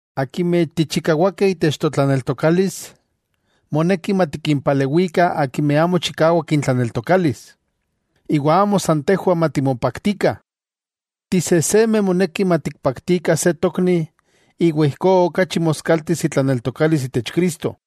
Akimeh tichikawakeh itech totlaneltokalis, moneki matikimpalewikah akimeh amo chikawak intlaneltokalis, iwa amo san tejwah matimopaktikah. Tisejsemeh moneki matikpaktikah se tokni iwa ijkó okachi moskaltis itlaneltokalis itech Cristo.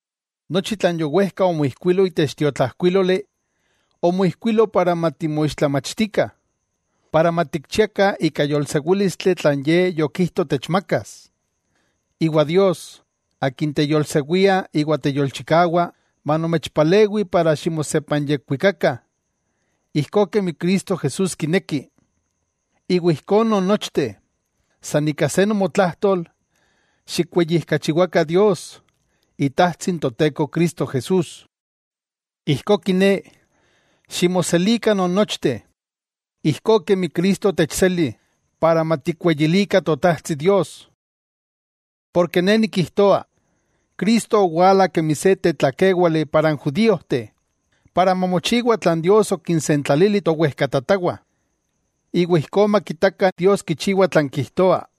Nochi tlan yowejka omoijkuilo itech tiotlajkuíloli, omoijkuilo para matimoixtlamachtikah, para matikchiakah ika yolsewílistli tlan Ye yokijto techmakas. Iwa Dios, Akin teyolsewia iwa teyolchikawa, manomechpalewi para ximosepanyekwikakah, ijkó kemi Cristo Jesús kineki. Iwa ijkó nonnochteh, san ika se nomotlájtol, xikweyijkachiwakah Dios, Itajtsi n Toteko Cristo Jesús. Ijkó kiné, ximoselikah non nochteh, ijkó kemi Cristo otechseli, para matikweyilikah Totajtsi Dios. Porke ne nikijtoa, Cristo owala kemi se tlakéwali para n judíojteh, para mamochiwa tlan Dios okinsentlalili towejkatatawah, iwa ijkó makitakah Dios kichiwa tlan kijtoa.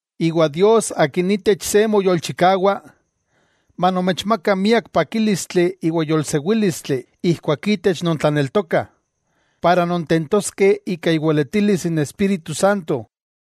Iwa Dios Akin itech se moyolchikawa, manomechmaka miak pakílistli iwa yolsewílistli ijkuak itech nontlaneltokah, para nontentoskeh ika iweletilis n Espíritu Santo.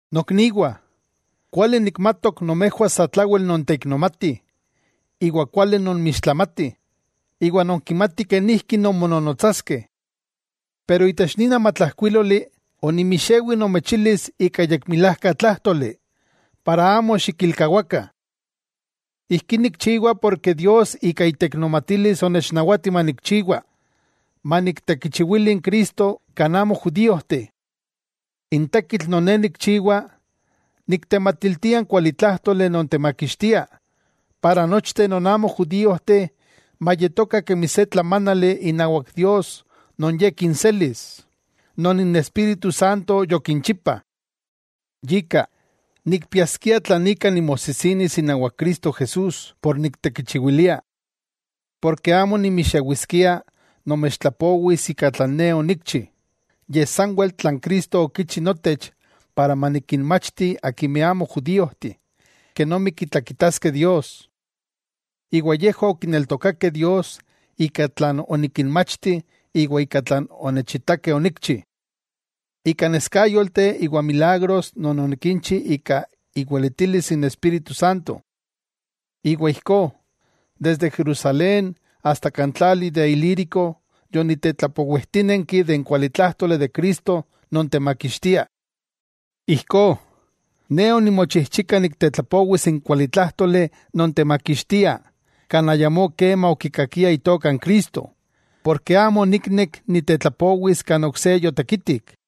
Nokniwah, kuali nikmatok nomejwah satlawel nonteiknomatih iwa kuali nonmixtlamatih, iwa nonkimatih kenijki nonmononotsaskeh. Pero itech nin amatlajkuíloli onimixewi nomechijilis ika yekmilajka tlájtoli, para amo xikilkawakah. Ijkí nikchiwa porke Dios ika iteiknomatilis onechnawati manikchiwa, maniktekichiwili n Cristo kan amo judíojteh. N tekitl non ne nikchiwa, niktematiltia n kuali tlájtoli non temakixtia, para nochteh non amo judíojteh mayetokah kemi se tlamánali inawak Dios non Ye kinselis, non n Espíritu Santo yokinchipa. Yika, nikpiaskia tlan ika nimosijsinis inawak Cristo Jesús, por niktekichiwilia. Porke amo nimixewiskia nomechtlapowis ika tlan ne onikchi, yej sanwel tlan Cristo okichi notech para manikinmachti akimeh amo judíojteh kenomi kitlakitaskeh Dios. Iwa yejwah okineltokakeh Dios ika tlan onikinmachti iwa ika tlan onechitakeh onikchi, ika neskáyolteh iwa milagros non onikinchi ika iweletilis n Espíritu Santo. Iwa ijkó, desde Jerusalén asta kan tlali de Ilírico, yonitetlapowijtínenki de n kualitlájtoli de Cristo non techmakixtia. Ijkó, ne onimochijchika niktetlapowis n kualitlájtoli non temakixtia kan ayamó kema okikakiah itoka n Cristo, porke amo oniknek nitetlapowis kan ok se yotekitik.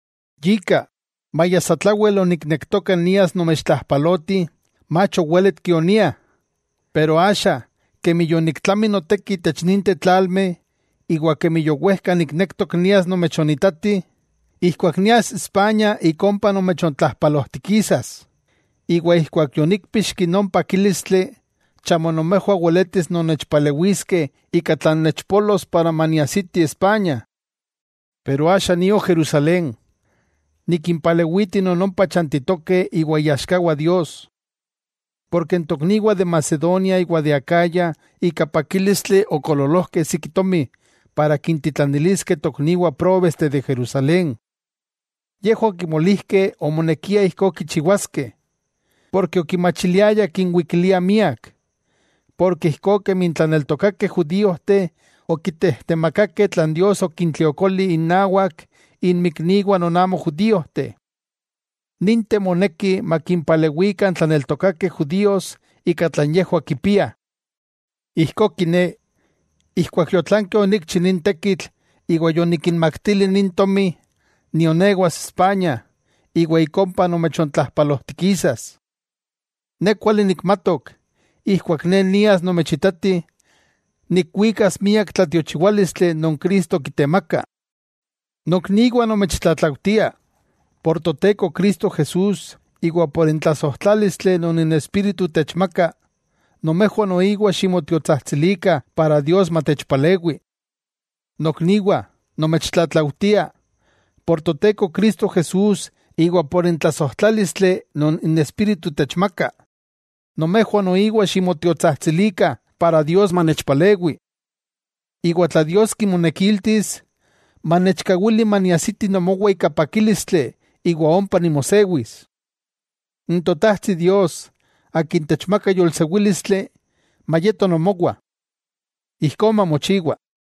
Yika, maya satlawel oniknektoka nias nomechontlajpaloti, mach owéletki onia. Pero axa kemi yoniktlami noteki itech ninteh tlalmeh, iwa kemi yowejka niknektok nias nomechonitatih, ijkuak nias Spaña ik ompa nomechontlajpalojtikisas. Iwa ijkuak yoníkpixki non pakílistli, chamo nomejwah weletis nonnechpalewiskeh ika tlan nechpolos para maniajsiti Spaña. Pero axa nio Jerusalén, nikimpalewiti non ompa chantitokeh iwa iaxkawah Dios. Porke n tokniwah de Macedonia iwa Acaya ika pakílistli okoololojkeh siki tomi para kintitlaniliskeh tokniwah próbesteh de Jerusalén. Yejwah okimolijkeh omonekia ijkó kichiwaskeh, porke okimachiliayah kinwikiliah miak; porke ijkó kemi n tlaneltokakeh judíojteh okitejtemakakeh tlan Dios okintliokoli innawak inmikniwah non amo judíojteh, ninteh moneki makinpalewikah n tlaneltokakeh judíos ika tlan yejwah kipiah. Ijkó kiné, ijkuak yotlanki onikchi nin tekitl iwa yonikinmaktili nin tomi, nionewas Spaña iwa ik ompa nomechontlajpalojtikisas. Ne kuali nikmatok, ijkuak ne nias nomechitati, nikwikas miak tlatiochiwálistli non Cristo kitemaka. Nokniwah nomechtlatlaujtia, por Toteko Cristo Jesús iwa por n tlasojtlálistli non n Espíritu techmaka, nomejwah noiwa ximotiotsajtsilikah para Dios manechpalewi. Nokniwah nomechtlatlaujtia, por Toteko Cristo Jesús iwa por n tlasojtlálistli non n Espíritu techmaka, nomejwah noiwa ximotiotsajtsilikah para Dios manechpalewi. Iwa tla Dios kimonekiltis, manechkawili maniajsiti nomowah ika pakílistli iwa ompa nimosewis. N Totajtsi Dios Akin techmaka yolsewílistli, mayeto nomowah. Ijkó mamochiwa.